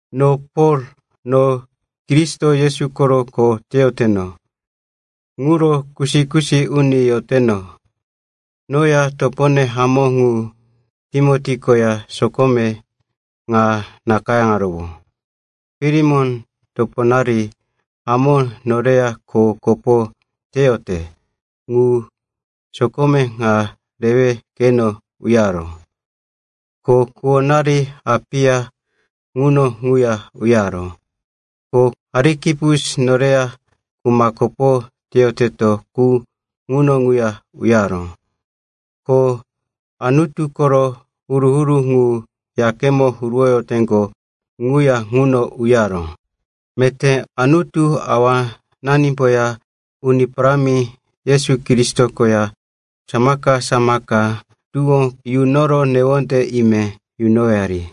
No Pol, no Kristo Yesu koro kho teyoteno ŋuro kusi-kusi uni yoteno. Noya topone hamó ŋu Timoti koya sokome ŋa nakayáŋarowó. Filemon, toponari hamó noreya kho koporo teyote qu, sokome ŋa rewe keno uyaró. Ko kuwonari Apia ŋuno ŋuya uyaró, ko Arikipus, noreya kuma kopo teyoteto qu, ŋuno ŋuya uyaró. Ko Anutu koro huru-huru ŋu yakemo huruwoyoteŋgo ŋuya ŋuno uyaró. Meté Anutu Awananimboya Uni Parámi Yesu Kristo koya samaka-samaka tuwó yunoro newonde ime yunowari.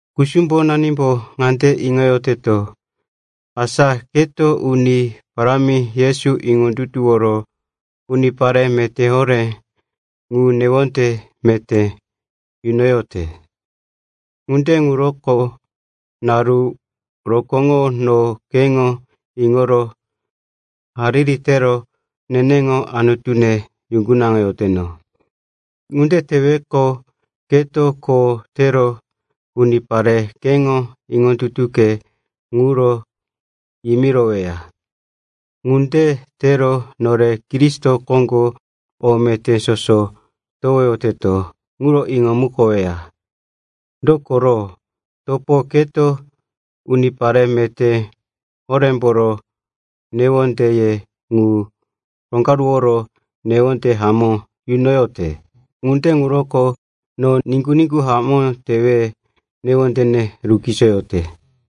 Kusumbonembo ŋande iŋoyote, asa keto Uni Parámi Yesu iŋondutuworo unipare meté horé ŋu newonde meté yunoyote. Ŋunde ŋuroko naru rokóŋo no keŋo iŋoro hariri tero neneŋo Anutune yuŋgunaŋoyoteno. Ŋunde teweqo, keto kho tero unipare keŋo iŋondutuke ŋuro yimiroweya. Ŋunde tero nore Kristo koŋgo o meté soso towoyoteto ŋuro iŋomukoweya. Dokoro, topo, keto unipare meté horémboro newondeye ŋu roŋgaruworo newonde hamó yunoyote. Ŋunde ŋuroko no niŋgu-niŋgu hamó tewe newondene rukisoyote.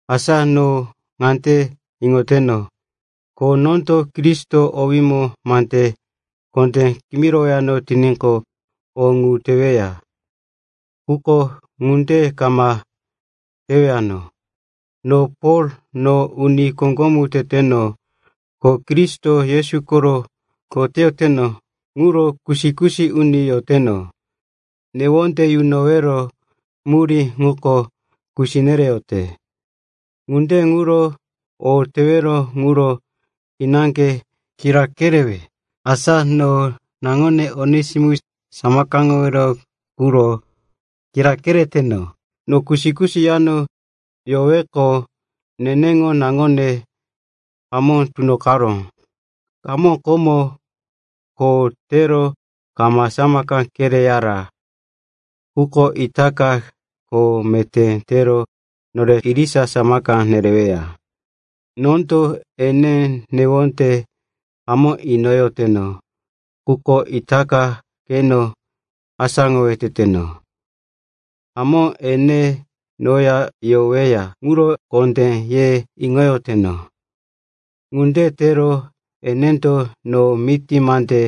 Asa no ŋande iŋoteno, ko nondo Kristo owímo mande kondé kimirowano tiníqo, o ŋu teweya. Quko ŋunde kama tewano. No Pol, no uni koŋgomu teteno, ko Kristo Yesu koro kho teyoteno ŋuro kusi-kusi uni yoteno. Newonde yunowero murí ŋuko kusi nereyote. Ŋunde ŋuro o tewero ŋuro kinaŋge kira kerewe. Asa no naŋone Onesimus samakaŋowero quro kira kereteno. No kusi-kusi yano yoroweqo neneŋo naŋone hamó tunoqaró. Hamó, komo kho tero kama samaka kereyara. Quko itaka kho meté tero nore irisa samaka nereweya. Nondo ene newonde hamó inoyoteno, quko itaka keno asáŋowe teteno. Hamó, ene noya yoreweya ŋuro kondé ye iŋoyoteno. Ŋunde tero enendo no miti mande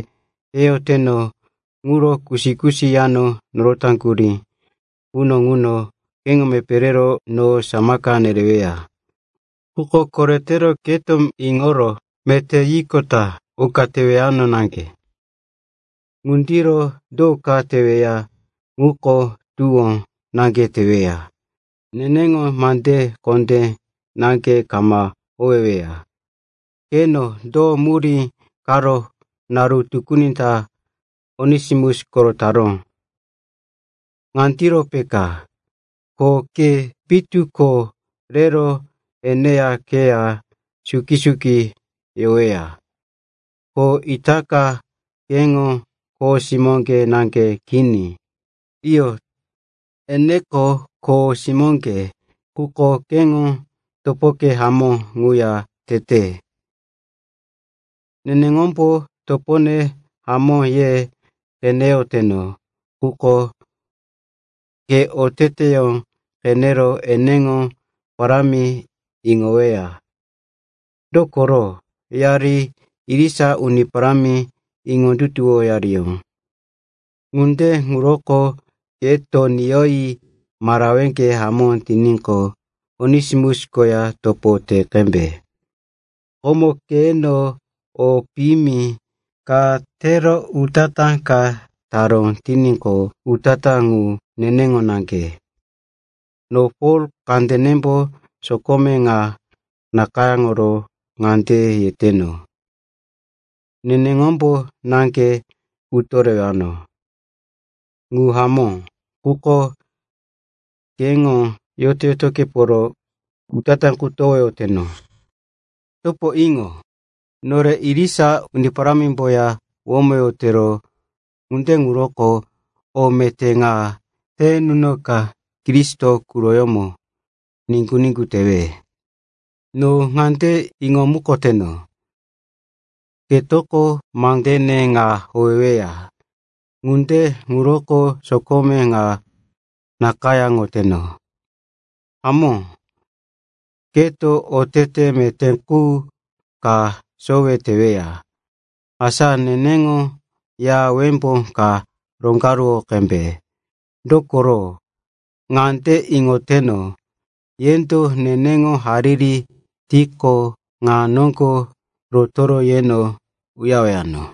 yeyoteno ŋuro kusi-kusi yano norotaŋgurí quno ŋuno keŋo mepé rero no samaka nereweya. Quko koretero keto iŋoro, “Meté,” yiqota oka tewano naŋge. Ŋundiro do ka teweya ŋuko tuwó naŋge teweya, neneŋo mande kondé naŋge kama howeweya. Qeno, do murí karo naru tukuni ta Onesimus korotaró? Ŋandiro peka, ko ke pitu ko rero eneya keya suki-suki yoweya. Ko itaka keŋo kho simó naŋge kini. Iyo, eneko kho simóŋge, quko keŋo topoke hamó ŋuya tete. Neneŋombo topone hamó ye qeneyoteno. Quko ke oteteyó qenero eneŋo parámi iŋoweya. Dokoro yari irisa Uni Parámi iŋondutuwoyariyó. Ŋunde ŋuroko keto niyoyi maraweke hamó tiníqo, Onesimus koya topo te qembe. Komo keno o piyimi ka tero utatá ka taró tiníqo, utatá ŋu neneŋo naŋge. No Pol, kandenembo sokome ŋa nakayáŋoro ŋande yeteno, neneŋombo naŋge utorewano. Ŋu hamó, quko keŋo yoto-yotokeporo utatá qu towoyoteno. Topo, iŋo. Nore irisa Uni Parámimboya womoyotero, ŋunde ŋuroko o meté ŋa te nunoka, Kristo quroyómo niŋgu-niŋgu tewe. No ŋande iŋomukoteno, ketoko mandene ŋa howeweya. Ŋunde ŋuroko sokome ŋa nakayáŋoteno. Hamó keto otete meté qu ka sowe teweya. Asa neneŋo ya wembó ka roŋgaruwo qembe, dokoro ŋande iŋoteno, yendo neneŋo hariri tiqo, ŋa noŋgo rotoro yeno uyarewano.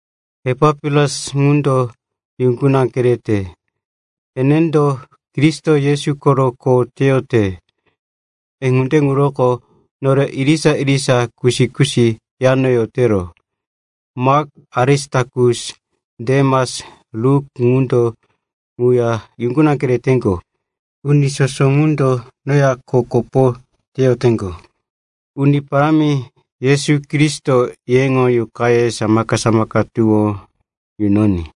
Epapiras ŋundo yuŋguna kereyote. Enendo Kristo Yesu koro kho teyote, ŋunde ŋuroko nore irisa-irisa kusi-kusi yano yotero. Mak, Arisitakus, Demas, Luk ŋundo ŋuya yuŋguna kereyoteŋgo. Uni soso ŋundo noya kho kopo teyoteŋgo. Uni Parámi Yesu Kristoko yeŋo yuqaye samaka-samaka tuwó yunoní.